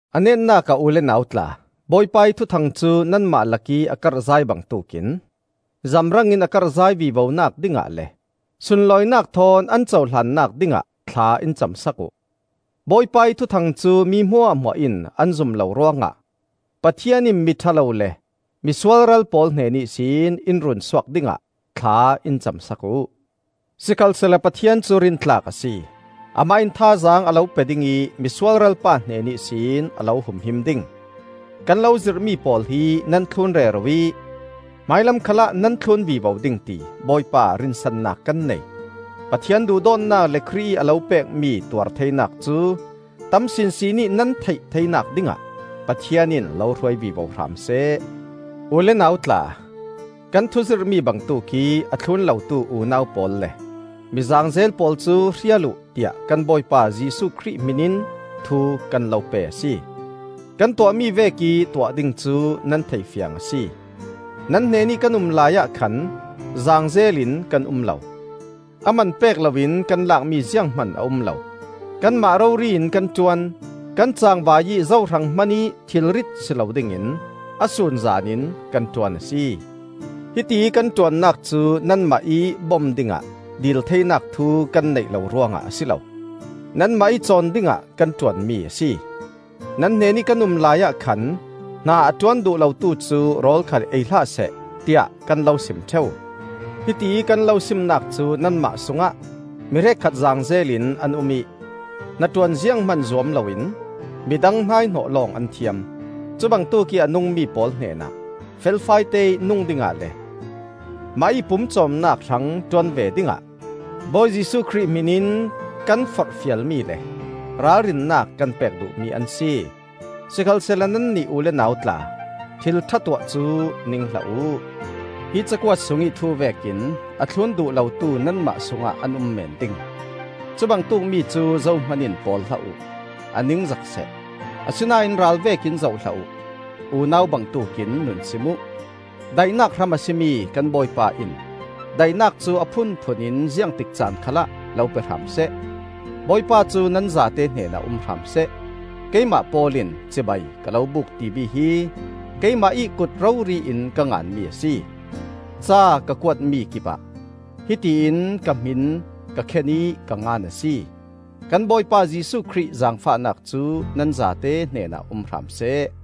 A netnak ah u le nau tla, Bawipa ih Thuthang cu nanmah lakih a karhzai bangtuk in zamrangin a karhzai vivonak dingah le sunloihnak thawn an cohlannak dingah thla in cam sak uh. Bawipa ih Thuthang cu mi hmuahhmuah in an zum lo ruangah Pathian in miṭha lo le mi sualral pawl hnen ihsin in runsuak dingah thla in cam sak uh. Sikhalsehla Pathian cu rintlak a si, amah in thazaang a lo pe ding ih Misualral pa hnen ihsin a lo humhim ding. Kan lo zirhmi pawl hi nan thlun rero ih hmailam khalah nan thlun vivo ding ti Bawipa ah rinsannak kan nei. Pathian duhdawtnak le Khrih ih a lo pekmi tuartheinak cu tam sinsin ih nan theih theinak dingah Pathian in lo hruai vivo hram seh. U le nau tla, kan thuzirhmi bangtuk ih a thlun lotu unau pawl le mi zaangzel pawl cu hrial uh, tiah kan Bawipa Jesuh Khrih hmin in thu kan lo pe a si. Kan tuahmi vekih tuah ding cu nan thei fiang a si. Nan hnenih kan um laiah khan zaangzel in kan um lo. A man pek loin kan lakmi zianghman a um lo. Kanmah rori in kan ṭuan, kan cangvai ih zo hrang hmanih thilrit si lo dingin a sunzan in kan ṭuan a si. Hitiih kan ṭuannak cu nanmah ih bom dingah dil theinak thu kan neih lo ruangah a si lo; nanmah ih cawn dingah kan ṭuanmi a si. Nan hnenih kan um laiah khan, “Hna a ṭuan duh lotu cu rawl khal ei hlahseh,” tiah kan lo sim ṭheu. Hitiih kan lo simnak cu nanmah sungah mi hrekkhat zaangzel in an um ih hnaṭuan zianghman zuam loin midang hnaihnawh lawng an thiam. Cubangtuk ih a nungmi pawl hnenah felfai teih nung dingah le mahih pumcawmnak hrang ṭuan ve dingah Bawi Jesuh Khrih hmin in kan forhfialmi le ralrinnak kan pek duhmi an si. Sikhalsehla nannih u le nau tla, thil ṭha tuah cu ning hlah uh. Hi cakuat sungih thu vekin a thlun duh lotu nanmah sungah an um meen ding. Cubangtuk mi cu zohman in pawl hlah uh, a ningzak seh. Asinain ral vekin zoh hlah uh; unau bangtuk in nun sim uh. Daihnak hram a si mi kan Bawipa in daihnak cu a phunphun in ziangtik caan khalah lo pe hram seh. Bawipa cu nan zate hnenah um hram seh. Keimah Paul in cibai ka lo buk timi hi keimah ih kut rori in ka nganmi a si. Ca ka kuatmi kipah hiti in ka hmin ka khen ih ka ngan a si. Kan Bawipa Jesuh Khrih zaangfahnak cu nan zate hnenah um hram seh.